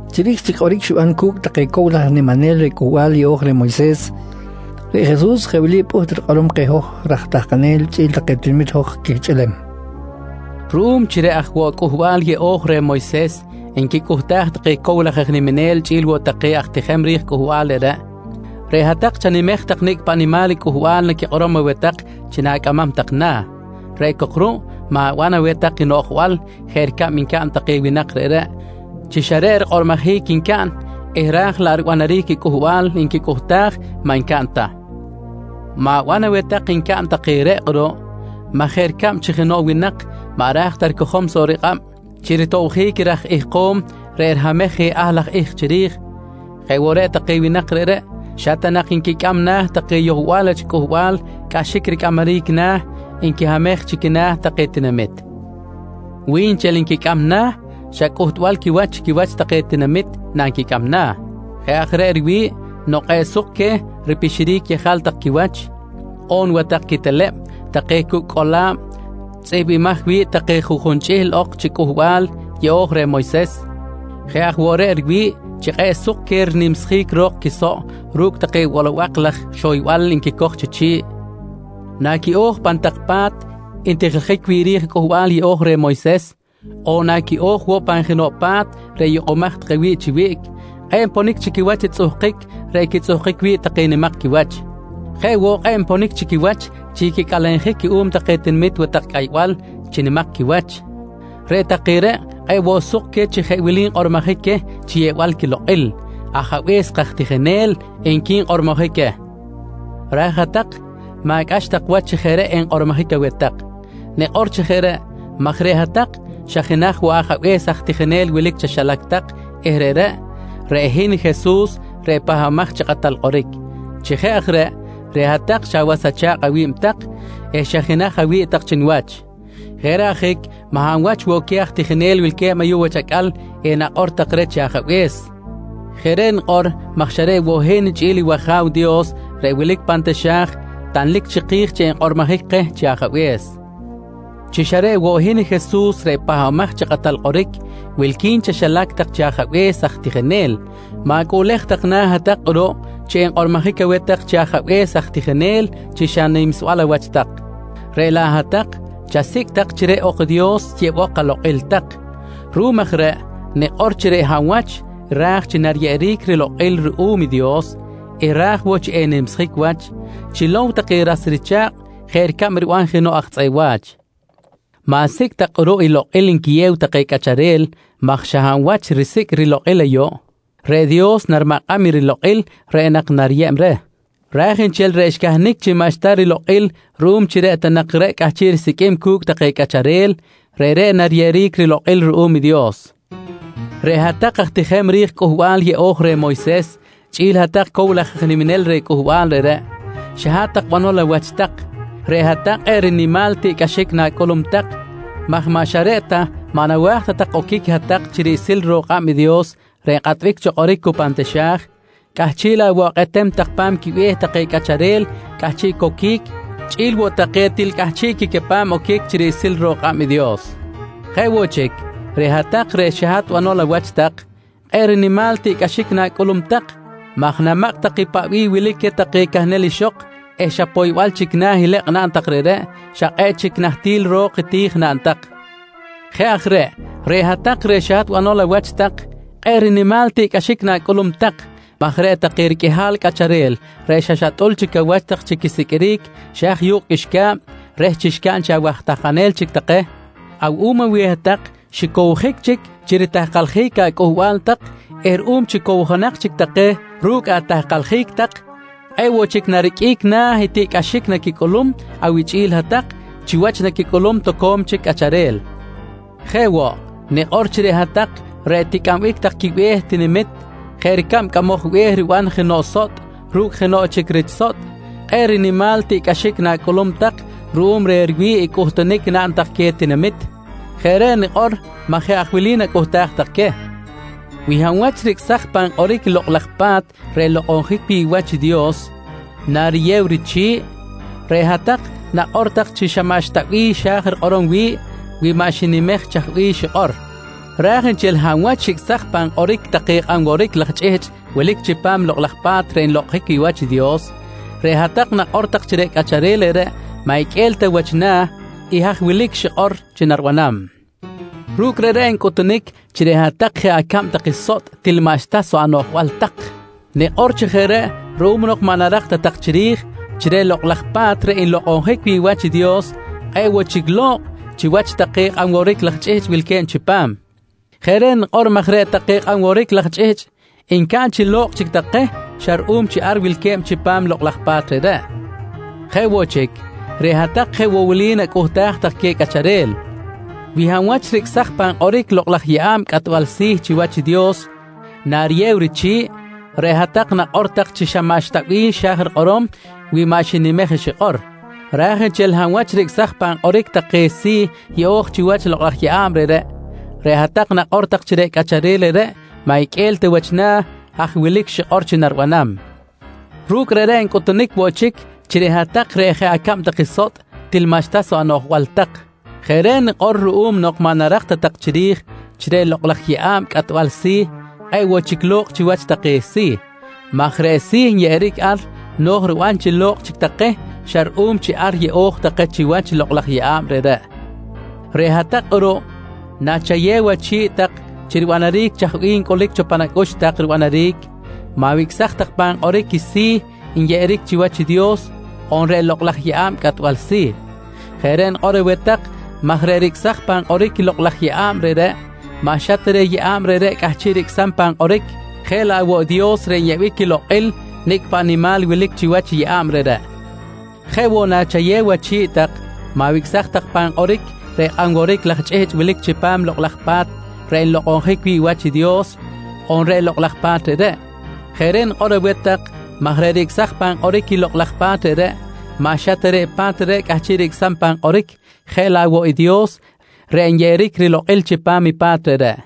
Chiri̱j chic kꞌoric xiban cu̱cꞌ take cow laj aj niminel reh Cꞌuhbal Yeꞌo̱j reh Moyses, reꞌ Jesus jeꞌ wili pꞌuht rikꞌorom keh hoj raj tahkanel chꞌi̱l take tinamit hoj quihchꞌihlem: «Ruꞌum chi reꞌ aj woꞌ Cꞌuhbal Yeꞌo̱j reh Moyses nquicꞌuhtaj take cow laj aj niminel chꞌi̱l woꞌ take aj tijem ri̱j cꞌuhbal reꞌreꞌ, reꞌ hat-tak chanimej tak i nicꞌ paꞌ nimal i cꞌuhbal naquikꞌorom aweh tak chi na̱cꞌamam tak na̱, reꞌ cok ruꞌ ma̱ban aweh tak i noꞌjbal jeꞌ ricab ncaꞌn take winak reꞌreꞌ chi xa reꞌ rikꞌormojic ncaꞌn eh raj laꞌ i ribanaric i cꞌuhbal nquicꞌuhtaj maꞌ ncaꞌn ta. Ma̱ban aweh tak ncaꞌn take reꞌ kꞌuruꞌ maj jeꞌ ricab chi jenoꞌ winak maꞌ ra̱j ta ricojom soꞌ rikꞌab chi ritobjic i raj ihkom reꞌ rihamej je ahl laj ihk chiri̱j, jeꞌ woꞌ reꞌ take winak reꞌreꞌ xa ta nak nquicꞌam na̱ take yohbal wach cꞌuhbal cꞌaxic ricꞌamaric na̱ nquihamej chi quina̱ take tinamit. Wi nchel nquicꞌam na̱, xa cꞌuhtbal quiwach chi quiwach take tinamit nanquicꞌam na̱. Jeꞌ aj reꞌ riwi̱ꞌ nok kꞌe̱ꞌ suk queh ripixiric yejal tak quiwach on watak quiteleb take cucꞌ cꞌola̱b tzꞌihmbimaj wi̱ꞌ take juꞌjun chꞌihl ok chi Cꞌuhbal Yeꞌo̱j reh Moyses. Jeꞌ aj woꞌ reꞌ riwi̱ꞌ chi kꞌe̱ꞌ suk queh rinimsjic ro̱k quisoꞌ ru̱cꞌ take bolobak laj xoybal nquicoj chi chi̱ꞌ. Naquiꞌo̱j pan tak pa̱t ntijiljic wi̱ꞌ ri̱j Cꞌuhbal Yeꞌo̱j reh Moyses, on naquiꞌo̱j woꞌ pan jenoꞌ pa̱t reꞌ yukꞌumaj take wi̱ꞌ chi wiꞌc, kꞌe̱ꞌ nponic chi quiwach i tzꞌuhkic reꞌ quitzꞌuhkic wi̱ꞌ take nimak quiwach. Jeꞌ woꞌ kꞌe̱ꞌ nponic chi quiwach chi quicꞌalenjic cuꞌum take tinamit watak cꞌaybal chi nimak quiwach. Reꞌ take reꞌ kꞌe̱ꞌ woꞌ suk queh chi jeꞌ wili nkꞌormojic queh chi yeꞌbal quilokꞌil: ‹Ajabe̱s kaj tijinel, nqui nkꞌormojic queh. «Raj hat-tak, ma̱cꞌax tak wach chi jeꞌ reꞌ enkꞌormojic aweh tak. Nikꞌor chi jeꞌ reꞌ maj reꞌ hat-tak, xa jenaj woꞌ Ajabe̱s aj tijinel wilic chaxilac tak eh reꞌreꞌ, reꞌ hin Jesus reꞌ Pahbamaj chi Kꞌatal Kꞌoric. Chi jeꞌ aj reꞌ, reꞌ hat-tak xa awas acha̱kꞌ awi̱b tak eh xa jenaj awi̱ꞌ tak chi niwach. Jeꞌ reꞌ ajic maꞌ hab wach woꞌ queh aj tijinel wilque̱b ayuꞌ wach acꞌal enakꞌor tak reh chi Ajabe̱s. Jeꞌ reꞌ nikꞌor maj xa reꞌ woꞌ i hin chꞌi̱l i wAja̱w Dios reꞌ wilic cho pan taxa̱j, tanlic chiki̱j chi enkꞌormojic keh chi Ajabe̱s. «Chi xa reꞌ woꞌ hin Jesus reꞌ Pahbamaj chi Kꞌatal Kꞌoric, wilqui̱n chaxilac tak chi Ajabe̱s aj tijinel, ma̱cꞌuꞌlej tak na̱ hat-tak kꞌuruꞌ chi enkꞌormojic aweh tak chi Ajabe̱s aj tijinel chi xa nimsbal awach tak. Reꞌ laꞌ hat-tak chasicꞌ tak chi reꞌ ok i Dios yeꞌbok alokꞌil tak. Ruꞌum aj reꞌ nikꞌor chi reꞌ hab wach ra̱j chi nariyeꞌeric rilokꞌil ruꞌum i Dios eh ra̱j woꞌ chi en-nimsjic wach, chilow take ras richa̱kꞌ jeꞌ ricab riban jenoꞌ aj tzꞌeꞌ wa̱ch. Ma̱sicꞌ tak kꞌuruꞌ i lokꞌil nquiyew take cꞌacharel maj xa hab wach risicꞌ i rilokꞌil ayuꞌ, reꞌ Dios narimakꞌam i rilokꞌil reꞌ nak nariyeb reh. Raj nchel reꞌ xcahnic chi maꞌxta rilokꞌil ruꞌum ta chi reꞌ ta nak reꞌ cꞌahchiꞌ risiqꞌuim cu̱cꞌ take cꞌacharel, reꞌreꞌ nariyeꞌeric rilokꞌil ruꞌum i Dios. «Reꞌ hat-tak aj tijem ri̱j Cꞌuhbal Yeꞌo̱j reh Moyses chꞌi̱l hat-tak cow laj aj niminel reh cꞌuhbal reꞌreꞌ, xa hat-tak banol awach tak. Reꞌ hat-tak kꞌe̱ꞌ rinimal tiꞌcꞌaxic na̱cꞌulum tak maj maꞌ xa reꞌ ta maꞌ nawa̱j ta tak oquic hat-tak chi riꞌsil ro̱k kꞌab i Dios reꞌ nkꞌatbic cho kꞌoric cu pan taxa̱j, cꞌahchiꞌ laꞌ woꞌ akꞌetem tak pa̱m quibe̱h take cꞌacharel cꞌahchiꞌ coquic chꞌi̱l woꞌ take til cꞌahchiꞌ quicapam oquic chi riꞌsil ro̱k kꞌab i Dios. «Jeꞌ woꞌ chic, reꞌ hat-tak reꞌ xa hat banol awach tak, kꞌe̱ꞌ rinimal tiꞌcꞌaxic na̱cꞌulum tak maj namakꞌ tak i paꞌ bih wilic queh take cahnel ixok eh xa poybal chic na̱ ilekꞌ naꞌn tak reꞌreꞌ, xa kꞌe̱ꞌ chic nahtil ro̱k i ti̱j naꞌn tak. Jeꞌ aj reꞌ, reꞌ hat-tak reꞌ xa hat banol awach tak kꞌe̱ꞌ rinimal tiꞌcꞌaxic na̱cꞌulum tak maj reꞌ take riqꞌuihal cꞌacharel reꞌ xa xatꞌul chic awach tak chi quisiqꞌuiric xa haj yu̱kꞌ qꞌuixca̱b reh chi xcaꞌn chi awaj tahkanel chic take, awuꞌum aweh hat-tak xicowjic chic chi ritahkaljic acꞌuhbal tak eh ruꞌum chi cowjonak chic take ru̱cꞌ atahkaljic tak, kꞌe̱ꞌ woꞌ chic nariqꞌuic na̱ i tiꞌcꞌaxic naquicꞌulum awichꞌi̱l hat-tak chiwach i naquicꞌulum toco̱m chic cꞌacharel. «Jeꞌ woꞌ, nikꞌor chi reꞌ hat-tak reꞌ ticꞌambic tak quibe̱h i tinamit jeꞌ ricab cꞌamoj be̱h riban jenoꞌ sotꞌ ru̱cꞌ jenoꞌ chic rich sotꞌ, kꞌe̱ꞌ rinimal tiꞌcꞌaxic na̱cꞌulum tak ruꞌum reh riwi̱ꞌ i cꞌuhtunic naꞌn tak queh tinamit. Jeꞌ reꞌ nikꞌor maj jeꞌ aj wili nacꞌuhtaj tak queh: Wi hab wach ricꞌsaj pan kꞌoric i Lokꞌ laj Pa̱t reꞌ nlokꞌonjic wi̱ꞌ wach i Dios nariyew richi̱ꞌ, reꞌ hat-tak nakꞌor tak chi xa maꞌxta bih xa̱j rikꞌorom wi̱ꞌ wi maꞌ xinimej i chaj bih xikꞌor. Raj nchel hab wach ricꞌsaj pan kꞌoric take nworwotic laj chꞌihchꞌ wilic chipam Lokꞌ laj Pa̱t reꞌ nlokꞌonjic wi̱ꞌ wach i Dios, reꞌ hat-tak nakꞌor tak chi reꞌ cꞌacharel reꞌreꞌ maꞌ iqꞌue̱l ta wach na̱ i haj wilic xikꞌor chi naribanam. Ru̱cꞌ reꞌreꞌ ncꞌutunic chi reꞌ hat-tak reꞌ jeꞌ acab tak sotꞌ, til maꞌxta soꞌ anoꞌjbal tak. Nikꞌor chi jeꞌ reꞌ ruꞌum nok maꞌ narak ta tak chiri̱j chi reꞌ Lokꞌ laj Pa̱t reꞌ nlokꞌonjic wi̱ꞌ wach i Dios kꞌe̱ꞌ woꞌ chic lo̱kꞌ chiwach take nworwotic laj chꞌihchꞌ wilque̱b chipam. Jeꞌ reꞌ nikꞌor maj reꞌ take nworwotic laj chꞌihchꞌ ncaꞌn chi lo̱kꞌ chic take xa ruꞌum chi ar wilque̱b chipam i lokꞌ laj pa̱t reꞌreꞌ. «Jeꞌ woꞌ chic, reꞌ hat-tak jeꞌ woꞌ wili nacꞌuhtaj tak queh cꞌacharel: Wi hab wach ricꞌsaj pan kꞌoric i lokꞌ laj yeꞌa̱b cꞌatbal si̱ chi wach i Dios nariyew richi̱ꞌ, reꞌ hat-tak nakꞌor tak chi xa maꞌxta bih xa̱j rikꞌorom wi maꞌ xinimej i xikꞌor. Raj nchel hab wach ricꞌsaj pan kꞌoric take si̱ yeꞌo̱j chiwach i lokꞌ laj yeꞌa̱b reꞌreꞌ, reꞌ hat-tak nakꞌor chi reꞌ cꞌacharel reꞌreꞌ maꞌ iqꞌue̱l ta wach na̱ haj wilic xikꞌor chi naribanam. Ru̱cꞌ reꞌreꞌ ncꞌuhtunic woꞌ chic chi reꞌ hat-tak reꞌ jeꞌ acab tak sotꞌ, til maꞌxta soꞌ anoꞌjbal tak. Jeꞌ reꞌ nikꞌor ruꞌum nok maꞌ narak ta tak chiri̱j chi reꞌ lokꞌ laj yeꞌa̱b cꞌatbal si̱ kꞌe̱ꞌ woꞌ chic lo̱kꞌ chiwach take si̱, maj reꞌ si̱ nyeꞌeric ar no̱j riban chi lo̱kꞌ chic take xa ruꞌum chi ar yeꞌo̱j take chiwach i lokꞌ laj yeꞌa̱b reꞌreꞌ. «Reꞌ hat-tak kꞌuruꞌ, nachayew achi̱ꞌ tak chi ribanaric chaj bih ncꞌulic pan acꞌux tak ribanaric, ma̱wicꞌsaj tak pan kꞌoric i si̱ nyeꞌeric chiwach i Dios on reꞌ lokꞌ laj yeꞌa̱b cꞌatbal si̱. Jeꞌ reꞌ nikꞌor aweh tak maj reꞌ ricꞌsaj pan kꞌoric i lokꞌ laj yeꞌa̱b reꞌreꞌ maꞌ xa ta reꞌ i yeꞌa̱b reꞌreꞌ cꞌahchiꞌ ricꞌsam pan kꞌoric jeꞌ laꞌ woꞌ i Dios reꞌ nyeꞌbic quilokꞌil i nicꞌ paꞌ nimal wilic chiwach i yeꞌa̱b reꞌreꞌ. Jeꞌ woꞌ nachayew achi̱ꞌ tak, ma̱wicꞌsaj tak pan kꞌoric reꞌ kꞌanworic laj chꞌihchꞌ wilic chipam Lokꞌ laj Pa̱t reꞌ nlokꞌonjic wi̱ꞌ wach i Dios on reꞌ lokꞌ laj pa̱t reꞌreꞌ. Jeꞌ reꞌ nikꞌor aweh tak maj reꞌ ricꞌsaj pan kꞌoric i lokꞌ laj pa̱t reꞌreꞌ, maꞌ xa ta reꞌ i pa̱t reꞌreꞌ cꞌahchiꞌ ricꞌsam pan kꞌoric jeꞌ laꞌ woꞌ i Dios reꞌ nyeꞌeric rilokꞌil chipam i pa̱t reꞌreꞌ.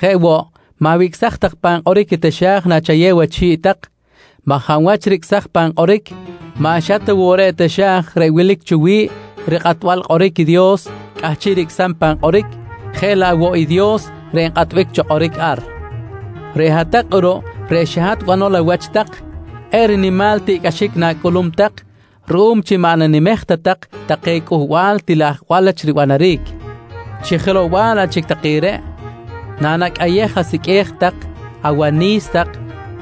Jeꞌ woꞌ, ma̱wicꞌsaj tak pan kꞌoric i taxa̱j nachayew achi̱ꞌ tak maj hab wach ricꞌsaj pan kꞌoric, maꞌ xa ta woꞌ reꞌ i taxa̱j reꞌ wilic cho wi̱ꞌ rikꞌatbal kꞌoric i Dios cꞌahchiꞌ ricꞌsam pan kꞌoric, jeꞌ laꞌ woꞌ i Dios reꞌ nkꞌatbic cho kꞌoric ar. «Reꞌ hat-tak kꞌuruꞌ reꞌ xa hat-tak banol awach tak, kꞌe̱ꞌ rinimal tiꞌcꞌaxic na̱cꞌulum tak ruꞌum chi maꞌ nanimej ta tak take cꞌuhbal til ajwal wach ribanaric. Chi jelow-bal laꞌ chic take reꞌ, nanacꞌayej asiqꞌue̱j tak, awani̱s tak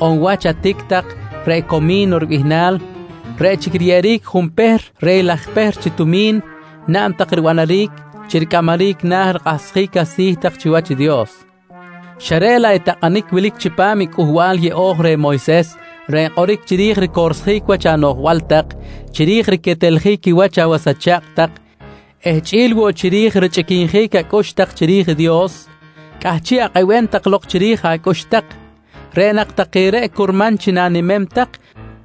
on i wach atic tak reꞌ “comi̱no” ribihnal, reꞌ chic riyeꞌeric junpehr reh i laj pehr chi tumi̱n naꞌn tak ribanaric chi ricꞌamaric na̱ rikꞌahsjic asi̱ tak chiwach i Dios, xa reꞌ laꞌ i takꞌanic wilic chipam i Cꞌuhbal Yeꞌo̱j reh Moyses reꞌ nkꞌoric chiri̱j ricorsjic wach anoꞌjbal tak, chiri̱j riqueteljic quiwach awas acha̱kꞌ tak eh chꞌi̱l woꞌ chiri̱j richꞌiquinjic acꞌux tak chiri̱j i Dios, cꞌahchiꞌ akꞌebem tak lok chiri̱j acꞌux tak. Reꞌ nak take reꞌ curman chi na̱nimem tak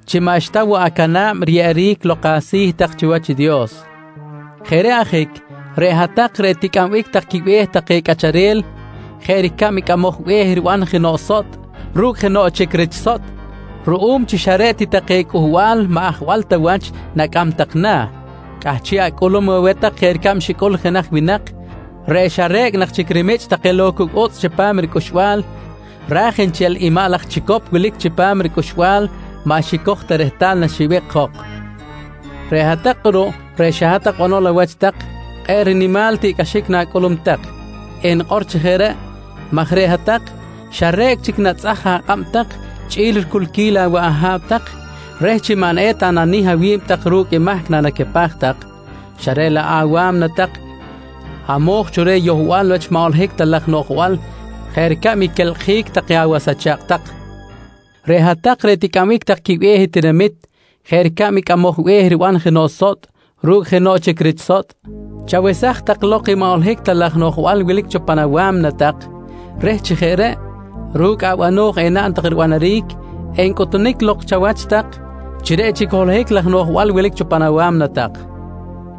chi maꞌxta woꞌ acana̱b riyeꞌeric lok asi̱ tak chiwach i Dios. Jeꞌ reꞌ ajic, reꞌ hat-tak reꞌ ticꞌambic tak quibe̱h take cꞌacharel jeꞌ ricab i cꞌamoj be̱h riban jenoꞌ sotꞌ ru̱cꞌ jenoꞌ chic rich sotꞌ, ruꞌum chi xa reꞌ ti take cꞌuhbal maꞌ ajwal ta wach nacꞌam tak na̱, cꞌahchiꞌ acꞌulum aweh tak jeꞌ ricab xicꞌul jenaj winak reꞌ xa re̱cꞌ nak chic rimichꞌ lok take cucꞌ utzꞌ chipam ricꞌuxbal, raj nchel i maꞌ laj chicop wilic chipam ricꞌuxbal maꞌ xicoj ta rehtal naxibikꞌ jok. «Reꞌ hat-tak kꞌuruꞌ reꞌ xa hat-tak banol awach tak, kꞌe̱ꞌ rinimal tiꞌcꞌaxic na̱cꞌulum tak eh nikꞌor chi jeꞌ reꞌ maj reꞌ hat-tak xa re̱cꞌ chic natzꞌaj akꞌab tak chꞌi̱l riculquil awaꞌ aha̱ꞌ tak reh chi maꞌ eta nanih awi̱b tak ru̱cꞌ i mahc nanacapaj tak, xa reꞌ laꞌ awa̱mna tak hamo̱j cho reh yohbal wach maꞌ holohic ta laj noꞌjbal jeꞌ ricab i quelkꞌjic take awas acha̱kꞌ tak. Reꞌ hat-tak reꞌ ticꞌambic tak quibe̱h i tinamit jeꞌ ricab i cꞌamoj be̱h riban jenoꞌ sotꞌ ru̱cꞌ jenoꞌ chic rich sotꞌ, chawesaj tak lok i maꞌ holohic ta laj noꞌjbal wilic cho pan awa̱mna tak reh chi jeꞌ reꞌ, ru̱cꞌ abano̱j enaꞌn tak ribanaric encꞌutunic lok chawach tak chi reꞌ chic i holohic laj noꞌjbal wilic cho pan awa̱mna tak.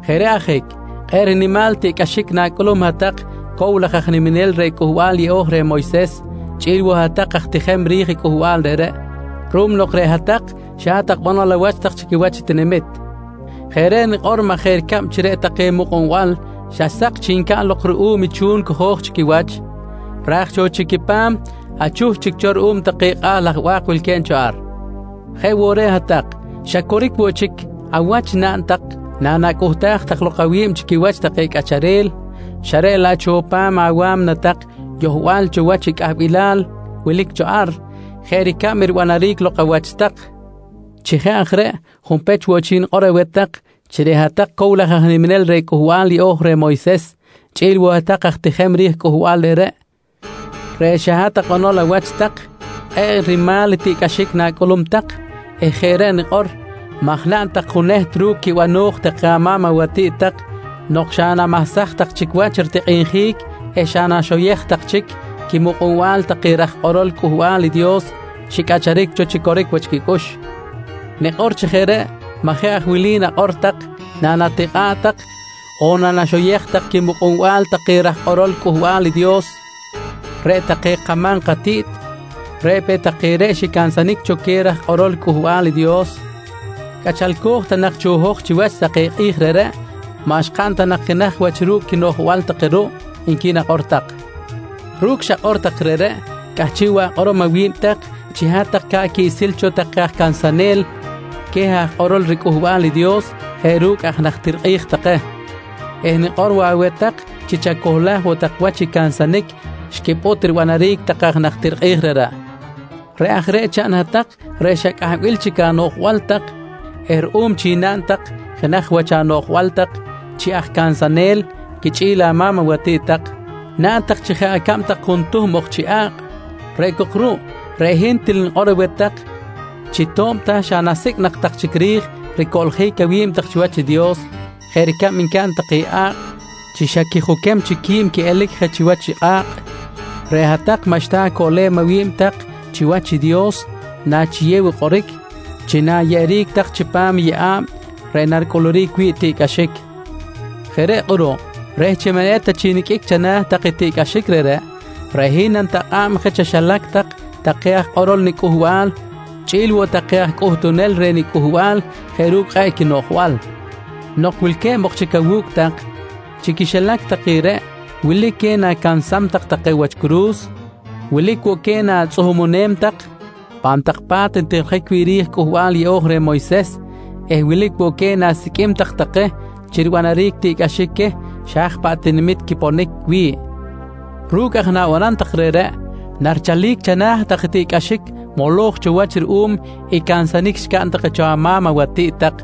Jeꞌ reꞌ ajic, kꞌe̱ꞌ rinimal tiꞌcꞌaxic na̱cꞌulum hat-tak cow laj aj niminel reh Cꞌuhbal Yeꞌo̱j reh Moyses chꞌi̱l woꞌ hat-tak aj tijem ri̱j cꞌuhbal reꞌreꞌ ruꞌum nok reꞌ hat-tak, xa hat-tak banol awach tak chi quiwach i tinamit. Jeꞌ reꞌ nikꞌor maj jeꞌ ricab chi reꞌ take mukꞌunbal xa sak chic ncaꞌn lok ruꞌum i chu̱n cojo̱j chi quiwach raj cho quipa̱m xa chuh chic cho ruꞌum take kꞌa̱ tak ba̱k wilque̱b cho ar, jeꞌ woꞌ reꞌ hat-tak xa coric woꞌ chic awach naꞌn tak nanacꞌuhtaj tak lok awi̱b chi quiwach take cꞌacharel, xa reꞌ laꞌ cho pa̱m awa̱mna tak yohbal cho wach i cꞌahbilal wilic cho ar jeꞌ ricab i ribanaric lok awach tak. «Chi jeꞌ aj reꞌ, junpech woꞌ chic nikꞌor aweh tak chi reꞌ hat-tak cow laj aj niminel reh Cꞌuhbal Yeꞌo̱j reh Moyses chꞌi̱l woꞌ hat-tak aj tijem ri̱j cꞌuhbal reꞌreꞌ, reꞌ xa hat-tak banol awach tak, kꞌe̱ꞌ rinimal tiꞌcꞌaxic na̱cꞌulum tak eh jeꞌ reꞌ nikꞌor maj naꞌn tak juneht ru̱cꞌ quibano̱j take ama̱m awatiꞌt tak nok xa namahsaj tak chic wach ritikꞌinjic eh xa naxoyej tak chic i quimukꞌunbal take raj kꞌorol Cꞌuhbal i Dios xicꞌacharic cho chi coric wach quicꞌux. Nikꞌor chi jeꞌ reꞌ maj jeꞌ aj wili nakꞌor tak, nanatikꞌa̱ꞌ tak on nanaxoyej tak quimukꞌunbal take raj kꞌorol Cꞌuhbal i Dios: ‹Reꞌ take kama̱m katiꞌt, reꞌ peꞌ take reꞌ xicansanic cho queh raj kꞌorol Cꞌuhbal i Dios. Cꞌachalco̱j ta nak cho hoj chiwach take kꞌi̱j reꞌreꞌ, maꞌ xkaꞌn ta nak jenaj wach ru̱cꞌ quinoꞌjbal take ruꞌ, nqui nakꞌor tak. «Ru̱cꞌ xakꞌor tak reꞌreꞌ, cꞌahchiꞌ woꞌ akꞌorom lok awi̱b tak chi hat-tak ca̱ꞌ quiꞌsil cho take aj cansanel queh aj kꞌorol riCꞌuhbal i Dios jeꞌ ru̱cꞌ aj najtir take. Eh nikꞌor woꞌ aweh tak chi chacohlaj woꞌ tak wach i cansanic xquipꞌut ribanaric take aj najtir reꞌreꞌ. Reꞌ aj reꞌ chaꞌn hat-tak reꞌ xa cꞌahbil chic anoꞌjbal tak eh ruꞌum chi naꞌn tak jenaj wach anoꞌjbal tak chi aj cansanel quichꞌi̱l ama̱m awatiꞌt tak, naꞌn tak chi jeꞌ acab tak juntuhm ok chi a̱kꞌ! Reꞌ cok ruꞌ, reꞌ hin til nikꞌor aweh tak chi to̱b ta xa nasicꞌ nak tak chic ri̱j ricoꞌljic awi̱b tak chiwach i Dios jeꞌ ricab ncaꞌn take a̱kꞌ chi xa quijuquic chic quiꞌelic je chiwach i kꞌa̱kꞌ, reꞌ hat-tak maꞌxta acoꞌlem awi̱b tak chiwach i Dios nachiyew i kꞌoric chi na̱yeꞌeric tak chipam i yeꞌa̱b reꞌ naricꞌuluric wi̱ꞌ tiꞌcꞌaxic. «Jeꞌ reꞌ kꞌuruꞌ, reh chi maꞌ eta chic niqꞌuic chana̱ tak i tiꞌcꞌaxic reꞌreꞌ, reꞌ hin nanitakꞌa̱b je chaxilac tak take aj kꞌorol niCꞌuhbal chꞌi̱l woꞌ take aj cꞌuhtunel reh niCꞌuhbal jeꞌ ru̱cꞌ kꞌe̱ꞌ quinoꞌjbal. Nok wilque̱b ok chic awu̱cꞌ tak, chi quixilac take reꞌ, wilic queh na̱cansam tak wach curu̱s, wilic woꞌ queh na̱tzꞌuhumunem tak pan tak pa̱t ntijiljic wi̱ꞌ ri̱j Cꞌuhbal Yeꞌo̱j reh Moyses eh wilic woꞌ queh na̱siqꞌuim tak take chi ribanaric tiꞌcꞌaxic queh xa haj paꞌ tinamit quiponic wi̱ꞌ. Ru̱cꞌ aj i na̱banam tak reꞌreꞌ, narichalic chana̱ tak i tiꞌcꞌaxic moloj cho wach ruꞌum i cansanic xcaꞌn take cho ama̱m awatiꞌt tak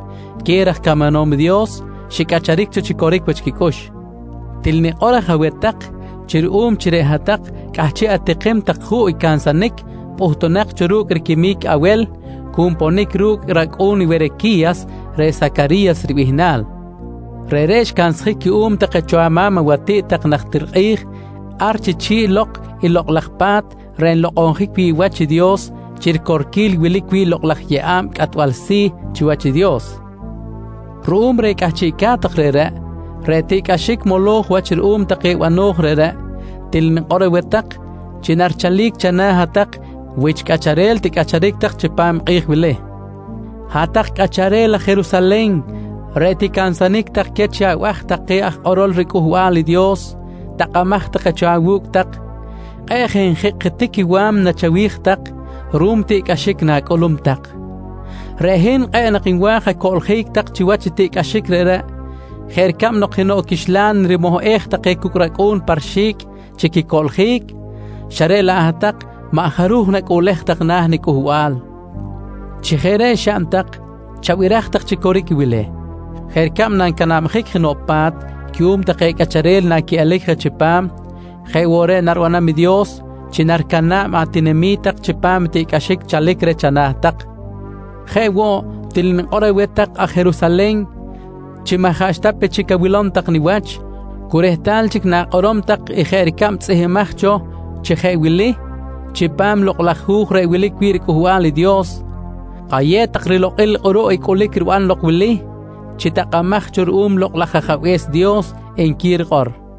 queh raj camanom i Dios xicꞌacharic cho chi coric wach quicꞌux. Til nikꞌor aj aweh tak chi ruꞌum chi reꞌ hat-tak cꞌahchiꞌ atikim tak juꞌ i cansanic pꞌuhtunak cho ru̱cꞌ riquimic Awel cu nponic ru̱cꞌ i racꞌu̱n Werequi̱yas, reꞌ Sacari̱yas ribihnal. Reꞌreꞌ xcansjic cuꞌum take cho ama̱m awatiꞌt tak najtir kꞌi̱j ar chi chi̱ꞌ lok i Lokꞌ laj Pa̱t reꞌ nlokꞌonjic wi̱ꞌ wach i Dios chi ricorquil i wilic wi̱ꞌ i lokꞌ laj yeꞌa̱b cꞌatbal si̱ chiwach i Dios. Ruꞌum reh cꞌahchiꞌca̱t tak reꞌreꞌ, reꞌ tiꞌcꞌaxic moloj wach ruꞌum take bano̱j reꞌreꞌ, til nikꞌor aweh tak chi narichalic chana̱ hat-tak wich cꞌacharel ticꞌacharic chipam take kꞌi̱j wili. «Hat-tak cꞌacharel aj Jerusalen reꞌ ticansanic tak queh chi abaj take aj kꞌorol riCꞌuhbal i Dios takꞌamaj take cho awu̱cꞌ tak, kꞌe̱ꞌ je njikꞌjitic i wa̱mna chawi̱j tak ruꞌum i tiꞌcꞌaxic na̱cꞌulum tak. Reꞌ hin kꞌe̱ꞌ nak nwa̱j acoꞌljic tak chiwach i tiꞌcꞌaxic reꞌreꞌ, jeꞌ ricab nok jenoꞌ quixlan rimohꞌej take cucꞌ racꞌu̱n pa rixi̱cꞌ chi quicoꞌljic, xa reꞌ laꞌ hat-tak maꞌ jaruj nacꞌuꞌlej tak na̱ niCꞌuhbal. Chi jeꞌ reꞌ xaꞌn tak, chabiraj tak chi coric i wili: Jeꞌ ricab nancanabjic jenoꞌ pa̱t cuꞌum take cꞌacharel naquiꞌelic je chipam, jeꞌ woꞌ reꞌ naribanam i Dios chi naricana̱b atinami̱t tak chipam i tiꞌcꞌaxic chalic reh chana̱ tak. Jeꞌ woꞌ til nikꞌor woꞌ aweh tak aj Jerusalen chi maꞌ jaꞌxta pe chic awilom tak niwach cu rehtal chic na̱kꞌorom tak i jeꞌ ricab tzꞌihmbimaj cho chi jeꞌ wili chipam Lokꞌ laj Hu̱j reꞌ wilic wi̱ꞌ riCꞌuhbal i Dios: “Kayew tak rilokꞌil kꞌuruꞌ i cꞌulic riban lok wili chi takꞌamaj cho ruꞌum i Lokꞌ laj Ajabe̱s Dios, nqui rikꞌor, nqui Jesus.